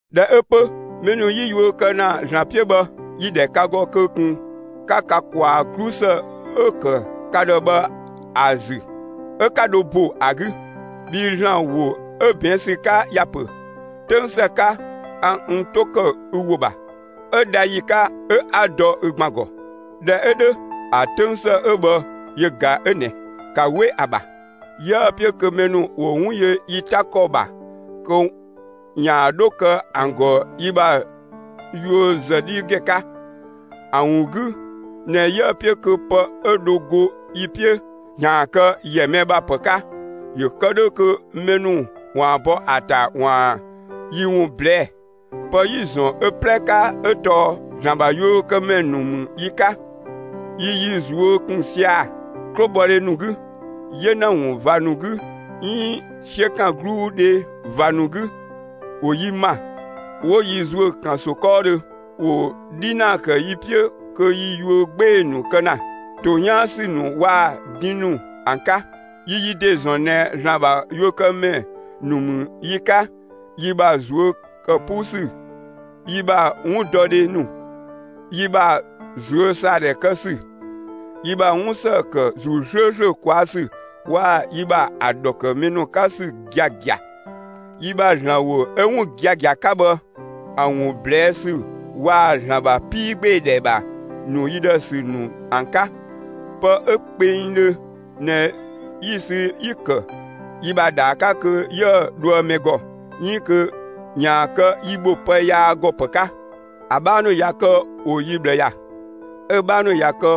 ꞊Dhɛ 'ö 'pö mɛ ‑nu 'yi yuö kë ‑na ‑Zlan 'piö bhë, yi‑ ‑dhɛ ka ‑gɔ kö ꞊kun 'ka ka ꞊kwaa 'glusë 'ö‑ ‑kë ka ‑dhë bhë ‑a ‑zü 'ö 'ka dho ‑bo ‑a 'gü. Bhii ‑Zlan ‑wo 'ö ꞊bɛɛn' ‑sü 'ka ‑ya ‑pö: 'Töng ‑së 'ka, a n 'to ‑kë ü ‑wo ‑bha; 'ö dha ‑yi 'ka 'ö 'a‑ dɔ ü ‑gban ‑gɔ. ꞊Dhɛ 'ö 'dhö ‑a 'töng ‑së 'ö bhë yö ꞊ga 'ö ꞊nɛ, ‑ka 'we ‑a ‑bha! 'Yiëë‑ 'piö kö mɛ ‑nu ‑wo 'wun yö yi 'ta ‑kɔ ‑bha kö ‑yaan 'dho kë ‑an ‑gɔ yi ‑bha yuö ‑zë 'dhi ‑gɛn 'ka, ‑a ‑wun 'gü ꞊nɛ 'yië‑ 'piö kö pë 'ö dho go yi 'piö ‑yaan kë ‑yɛ mɛ ‑bha ‑pë 'ka ‑yö kë 'dhö kö mɛ ‑nu ‑waan bɔ ‑a ‑ta ‑waan yi ‑wun ꞊blɛɛ'‑. Pë 'yi‑ ‑zɔn ö 'plɛ 'ka 'ö tɔɔ ‑Zlan ‑bha yuökëmɛ ‑nu ‑mü yi 'ka. Yi yi ꞊zuö' ‑kun sia‑ 'klobhɔdhe ‑nu 'gü, 'yena ‑wun ꞊va ‑nu 'gü 'iin 'siökangluudhe ꞊va ‑nu 'gü. ‑Wo yi ‑ma, 'wo yi ‑zuö ‑kanso 'kɔɔdhö; ‑wo 'dhinaa ‑kë yi 'piö kö yi yuö 'gbee‑ ‑nu kë ‑na, ‑to 'yaan ‑sü ‑nu waa‑ din ‑nu ‑an 'ka. Yi yi ‑de ‑zɔn ꞊nɛ ‑Zlan ‑bha yuökëmɛ ‑nu ‑mü yi 'ka yi ‑bha ꞊zuö' ‑kë 'puu ‑sü, yi ‑bha 'wundɔdhe ‑nu, yi ‑bha ꞊zuösaadhɛ kë ‑sü, yi ‑bha 'wun ‑së ‑kë ‑Zuu 'slööslö ꞊kwaa' ‑sü waa‑ yi ‑bha ‑a ‑dhɔ ‑kë mɛ ‑nu 'ka ‑sü giagia, yi ‑bha ‑Zlan ‑wo 'ö 'wun giagia 'ka bhë ‑a ‑wun ꞊blɛɛ' ‑sü waa‑ ‑Zlan ‑bha 'piigbeedhɛ ‑bha ‑nu yi ‑dhë ‑sü ‑nu ‑an 'ka. Pë 'ö kpengdhö ꞊nɛ 'yi‑ sü 'yi‑ ‑kë yi ‑bha ‑dhaa 'ka kö 'yië‑ dhoë mɛ ‑gɔ, 'iin kö ‑yaan kë yi bho pë yaa ‑gɔ ‑pë 'ka. ‑A 'bhaa ‑nu ꞊ya kë ‑wo yi ꞊bhlë ‑ya, 'ö‑ 'bhaa ‑nu ꞊ya kë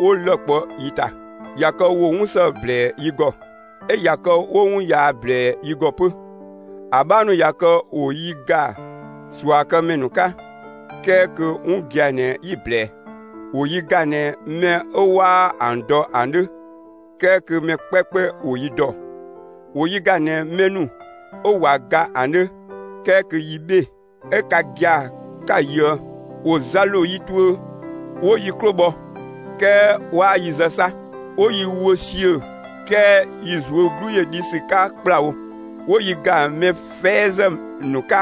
'wo lë‑ kpɔ yi ‑ta; ꞊ya kë ‑wo 'wun ‑së ‑blɛɛ yi ‑gɔ, 'ö ꞊ya kë 'wo 'wun yaa ꞊blɛɛ yi ‑gɔ 'pö. ‑A 'bhaa ‑nu ꞊ya kë ‑wo yi ‑ga ꞊suakëmɛ ‑nu 'ka, 'kɛɛ kö 'wun gia‑ ꞊nɛ 'yi‑ ꞊blɛɛ, ‑wo yi ‑ga ꞊nɛ mɛ 'ö 'waa ‑an dɔ ‑an 'dhö 'kɛɛ kö mɛ 'kpɛɛkpɛ ‑wo yi ‑dɔ; 'wo yi ‑ga ꞊nɛ mɛ ‑nu 'ö ꞊wa ga ‑an 'dhö 'kɛɛ kö yi 'bhee‑, 'ö ka gia‑ 'ka‑ yöë. ‑Wo za ‑lo yi tuö, 'wo yi 'klo bhɔ 'kɛɛ waa yi zë 'sa! 'Wo yi wö ‑siö 'kɛɛ yi ꞊zuö' 'glu ‑yö dhi ‑sü 'ka ‑kplawo. ‑Wo yi ‑ga mɛ 'fɛɛzë ‑nu 'ka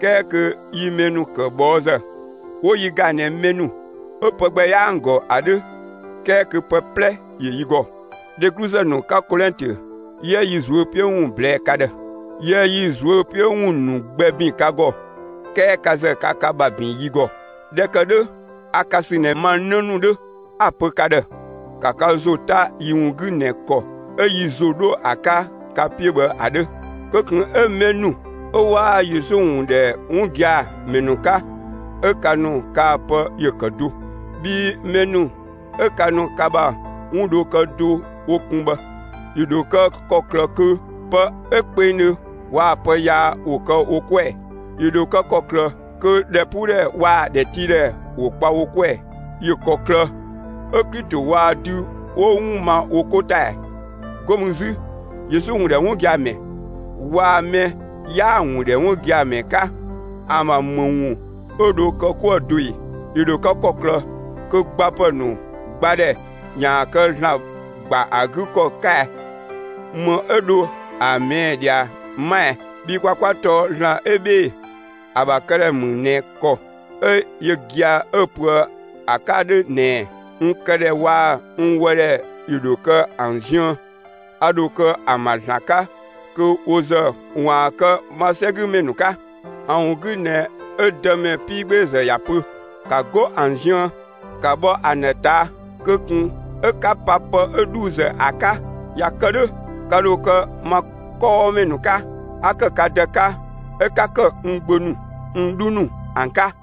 'kɛɛ kö yi mɛ ‑nu ‑kë ꞊bhɔɔzë; ‑wo yi ‑ga ꞊nɛ mɛ ‑nu 'ö pë gbɛ 'yaa ‑an ‑gɔ ‑a 'dhö 'kɛɛ kö pë 'plɛ ‑yö yi ‑gɔ. Dhegluzë ‑nu 'ka Kolɛntö, 'yië yi ꞊zuö' 'piö ‑wun ꞊blɛɛ'‑ ka ‑dhë. Yiëë yi ꞊zuö' 'piö ‑wun ‑nu gbɛ ‑bin ka ‑gɔ, 'kɛɛ ka ‑zë ka ka ‑bha ‑bin yi ‑gɔ. ꞊Dhɛ ‑kë 'dhö, a ka ‑sü ꞊nɛ ma 'në ‑nu 'dhö; a‑ ‑pö ka ‑dhë: ‑Ka ka ‑zo 'ta yi ‑wun 'gü ꞊nɛ ‑kɔ 'ö yi ‑zo 'dho ‑a 'ka ka 'piö bhë ‑a 'dhö! Kö ꞊kun 'ö mɛ ‑nu 'ö 'waa Yesu ‑wun ‑dhɛ 'wun gia‑ ‑mɛ ‑nu 'ka 'ö ka ‑nu kaa‑ pë ‑yö ‑kë do, bhii mɛ ‑nu 'ö ka ‑nu ka ‑bha 'wun dho kë do wo kun bhë. ‑Yö ‑dho kë ‑kɔklë kö pë 'ö kpengdhö waa‑ pë yaa ‑wo kë wo 'kuë‑ ‑ɛ? ‑Yö ‑dho kë ‑kɔklë kö ‑dhɛpuudhɛ waa‑ ‑dhɛtiidhɛ ‑wo kpa wo 'kuë‑ ‑ɛ? ‑Yö ‑kɔklë 'ö Klito waa‑ dü 'wo 'wun ma wo 'ko ‑ta ‑ɛ? 'Go mü 'zü Yesu ‑wun ‑dhɛ 'wun gia‑ ‑mɛ waa‑ mɛ 'yaa‑ ‑wun ‑dhɛ 'wun gia‑ ‑mɛ 'ka ‑an ‑bha ‑më ‑wun 'ö dho kë 'kuë‑ do ꞊e? ‑Yö ‑dho kë ‑kɔklë kö gbapë ‑nu gbadhɛ ‑yaan kë ‑Zlan ‑gba ‑a 'gü ‑kɔ 'ka ɛ? ‑Më 'ö dho ‑a ꞊mɛɛ' ꞊dhia 'ma ɛɛ? Bhii kwa 'kwa tɔɔ ‑Zlan 'ö 'bhee‑ ‑a ‑bha këdhɛ mü ꞊nɛ ‑kɔ 'ö yö gia‑ 'ö‑ pöë ‑a 'ka 'dhö ꞊nɛɛ: «N këdhɛ waa‑ n ‑wɔdhɛ ‑yö ‑dho kë ‑an ziën, a ‑dho kë ‑an ‑bha ‑Zlan 'ka kö wo ‑zë ‑waan kë ma 'sɛgümɛ ‑nu 'ka.» ‑A ‑wun 'gü ꞊nɛ 'ö Dëmɛ 'piigbeezë ꞊ya pö: «‑Ka 'go ‑an ziën, 'ka bhɔ ‑an ‑dhë ꞊taa', kö ꞊kun 'ö 'ka pa pë 'ö ‑dhuuzë ‑a 'ka! ꞊Ya kë 'dhö, ka ‑dho kë ma 'kɔɔmɛ ‑nu 'ka, 'a ‑kë ka Dë 'ka, 'ö 'ka ‑kë n gbö ‑nu, n 'dhu ‑nu ‑an 'ka.»